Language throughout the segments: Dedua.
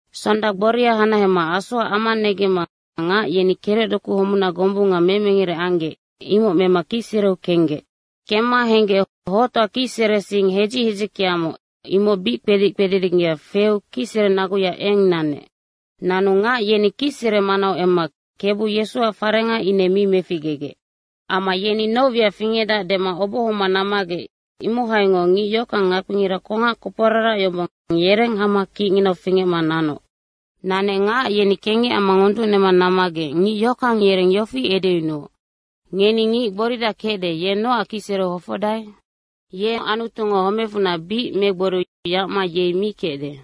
Sonda gboria hanahema asoac ama negemma ngac yeni kerecdoku homuna gombunga memengere anggec, imoc mema kicsereu kenggec. Kemma henggec hoctoa kicsere sing hedzic hedzickeamoc, imoc bic kpedic kpedidinggea feu kicsere naguya eng nanec. Nanu ngac yeni kicsere manau emma Kebu Yesuac farenga ine mi meficgegec. Amma yeni noc wiac fingecdac dema obohoma nammagec imohaingoc ngic yohockang ngakpingira kongac koporarac yombong, yereng hama kicnginau fingecma nanoc. Nanec ngac yeni kengec amma ngonducnema nammagec ngic yohockang yereng yofi edeyunuoc, “Ngeni ngic gboridac kecde, ye nocac kicsereu hofocdae? Yenoc Anutungo homecfunac bic megboriu yacma yei mi kecde.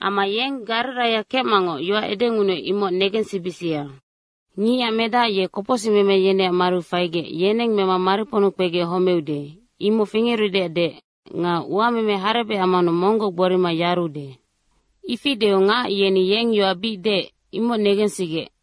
Amma yeng Gariraia kecmangoc yoac edengunuec, imoc negensibisia. ‘Ngicac Medac ye kopocsicmeme yeneac mariu faigec, yeneng mema mariponnu kpegec homeude.’ imoc fingerudeac deec, ‘Nga uameme harebec ammanu monggoc gborima yarude.’” Ifi deu ngac yeni yeng yoac bic deec, imoc negensigec.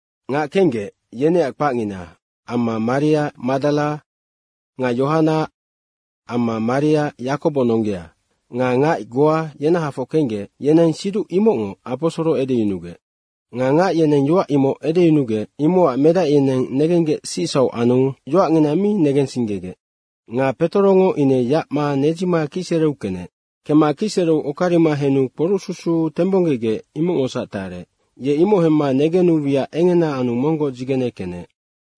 Ngac kenggec, yeneac kpacngina Maria Madara nga Yohana amma Maria Yakobo nonggea nga ngac goa yenahafoc kenggec, yeneng siduc imocngoc aposoro edeyunugec. Nga ngac yeneng yoac imoc edeyunugec, imocac medac yeneng negenggec sicsauc anu yoacngina mi negensinggegec. Nga Petorongo ine yacma nedzima kicsereu kenec. Kemma kicsereu okarima henu kporucsusu tembonggegec imocngosac tarec. Ye imoc hemma negenu wiac engena anu monggoc dzigene kenec.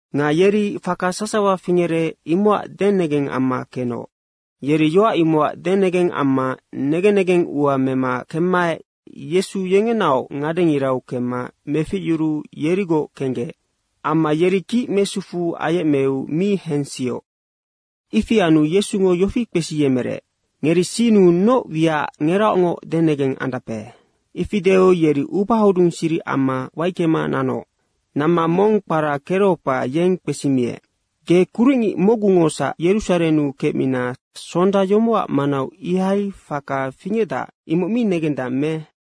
Nga yeri faka sasawa fingerec, imocac denegeng amma kenoc. Yeri yoac imocac denegeng amma negen negeng ua mema kemmaec Yesu yengenaoc ngadengirau kemma meficyuruu yerigoc kenggec. Amma yeri kic mesufuu ayecmeu mi hensioc. Ifi anu Yesungo yofi kpesiyemerec, “Ngeri sinnu noc wiacac ngeraocngoc denegeng andape?” Ifi deu yeri ubahodung siric amma waickema nanoc. Namma mong kpara Kereopa, yeng kpesimiec, “Ge kuricngic mocgungosac Yerusarennu kecmina sonda yomocac manau ihai faka fingecdac, imoc mi negendang me?”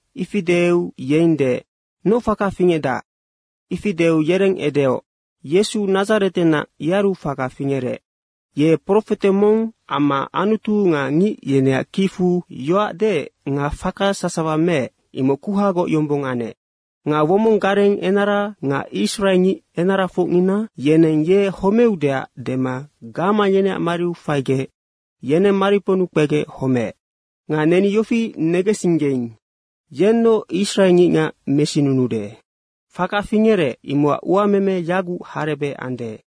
Ifi deu yeng deec, “Noc faka fingecdac?” Ifi deu yereng edeoc, “Yesu Nadzaretenac yearu faka fingerec. Ye profete mong amma Anutu nga ngic yeneac kicfu yoac deec nga faka sasawa meec, imoc kuhagoc yombong anec. Nga womong gareng enara nga israengic enarafocnina, yeneng ye homeudeac dema gamang yeneac mariu faigec yeneng mariponnu kpegec homeec. Nga neni yofi negensinggeing, yennoc israengicngac mesinunuude. Faka fingerec, imocac uameme yaguc harebec ande.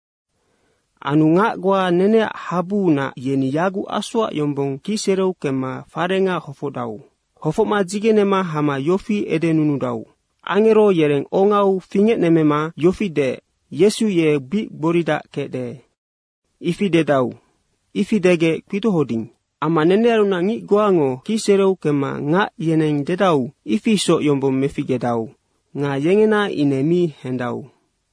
Anu ngac goa neneac habuunac, yeni yaguc asoac yombong kicsereu kemma farenga hofocdau. Hofocma dzigenema hama yofi edenunudau, ‘Angero yereng ongau fingecnemmema yofi deec, “Yesu ye bic gboridac kecde.” ifi dedau.’ Ifi degec kpidohoding. Amma nenearunac ngic goango kicsereu kemma ngac yeneng dedau, ifi isoc yombong meficgedau nga yengena ine mi hendau.”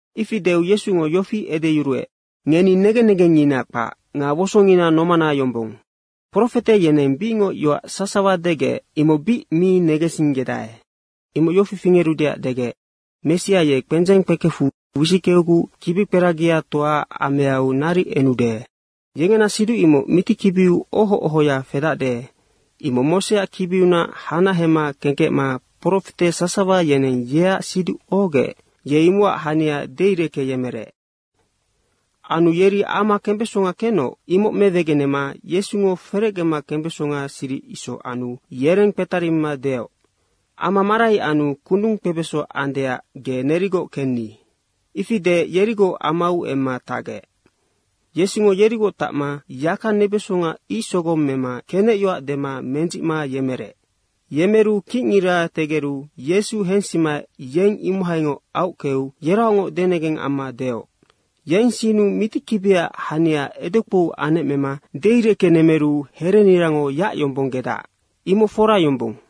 Ifi deu Yesungo yofi edeyuruec, “Ngeni negen negengngina kpac nga wosongina nomana yombong. Profete yeneng bicngoc yoac sasawa degec, imoc bic mi negensinggedae. Imoc yofi fingerudeac degec, ‘Messia ye kpendzeng kpekefu wisickeuguc kibikperagiatoaac ameau naric enude.’” Yengena siduc imoc mitikibiu oho ohoya fedacde, imoc Moseac kibiunac hanahema kengkecma profete sasawa yeneng yeac siduc ohogec, ye imocac hania deireckeyemerec. Anu yeri ama kembesonga kenoc, imoc mewegenema Yesungo ferecgema kembeso siric isoc anu yereng kpetarimima deoc, “Ama marai anu kundung kpebeso andeac ge nerigoc kenni.” Ifi deec yerigoc amau emma tacgec. Yesungo yerigoc tacma yaka nebesonga ic sogong mema kenecyoac dema mendzicma yemerec. Yemeru kicngira tegeru Yesu hensimaec yeng imohaingoc aockeu yeraocngoc denegeng amma deoc, “Yeng sinnu mitikibiac hania edekpou anecmema deireckenemeru herenirango yacyombonggedac, imoc fora yombong.”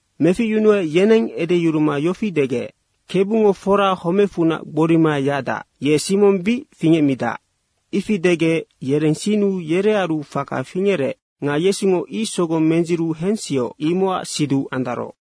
Meficyunuec yeneng edeyuruma yofi degec, “Kebungo fora homecfunac gborima yacdac, ye Simong bic fingecmidac.” Ifi degec yereng sinnu yerearu faka fingerec nga Yesungo ic sogong mendziru hensioc, imocac siduc andaroc.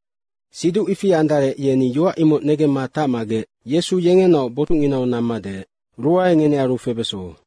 Siduc ifi andarec yeni yoac imoc negemma tacmagec Yesu yengenaoc botucnginau namma deec, “Ruae ngenearu febeso.”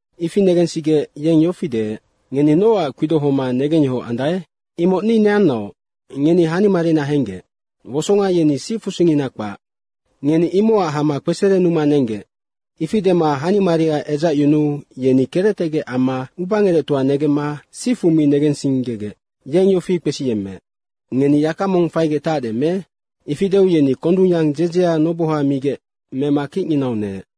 Ifi negensigec yeng yofi deec, “Ngeni nocac kpidohoma negengyohoc andae? Imoc ni neanaoc, ngeni hanimarina henggec. Wosonga yeni sicfusingina kpac. Ngeni imocac hama kpeserenuma nenggec.” Ifi dema hanimaria edzacyunuu yeni kerectegec amma ubangerectoa negemma sifu mi negensinggegec yeng yofi kpesiyemmeec, “Ngeni yaka mong faigec tacde me?” Ifi deu yeni kondungyang dzedzea noboha migec mema kicnginau neec.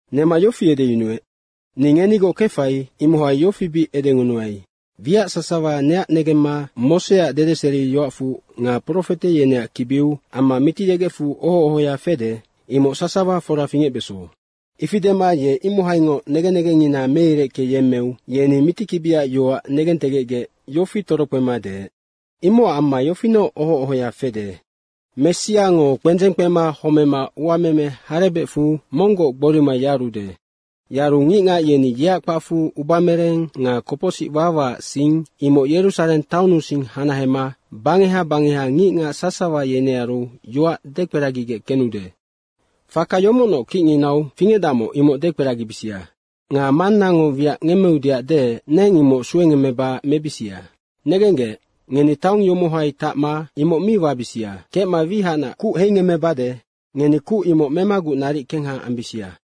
Nema yofi edeyunuec, “Ni ngenigoc kefai, imohai yofi bic edengunuai, wiac sasawa neac negemma Moseac dedeseriyoacfu nga profete yeneac kibiu amma Mitiyegecfu oho ohoya fede, imoc sasawa fora fingecbeso.” Ifi dema ye imohaingoc negen negengngina meireckeyemmeu yeni mitikibiac yoac negentegecgec yofi torokpema deec, “Imocac amma yofinoc oho ohoya fede, Messiango kpendzeng kpema homema uameme harebecfu monggoc gborima yarude. Yaru ngicngac yeni yeac kpacfu ubamereng nga kopocsic wawaac sing imoc Yerusareng taonnusing hanahema bangeha bangeha ngicngac sasawa yenearu yoac dekperagigec kenude. Faka yomocnoc kicnginau fingecdacmoc imoc dekperagibisia. Nga Mannango wiac ngemmeudeac deec, neng imoc suengemmeba mebisia. Negenggec, ngeni taong yomohai tacma imoc mi wabisia kecma wihacnac kuc heingemmebade. Ngeni kuc imoc memaguc naric kengha ambisia.”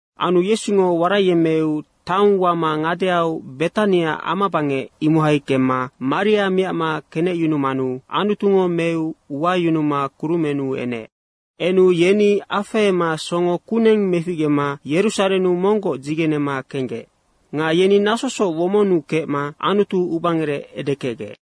Anu Yesungo waraiyemmeu taong wama ngadeau Betania amabangec, imohai kemma maria miacma kenecyunumanu Anutungo meu wayunuma kurumennu enec. Enu yeni afehema songo kuneng meficgema Yerusarennu monggoc dzigenema kenggec. Nga yeni nasosoc womonnu kecma Anutu ubangerec edekecgec.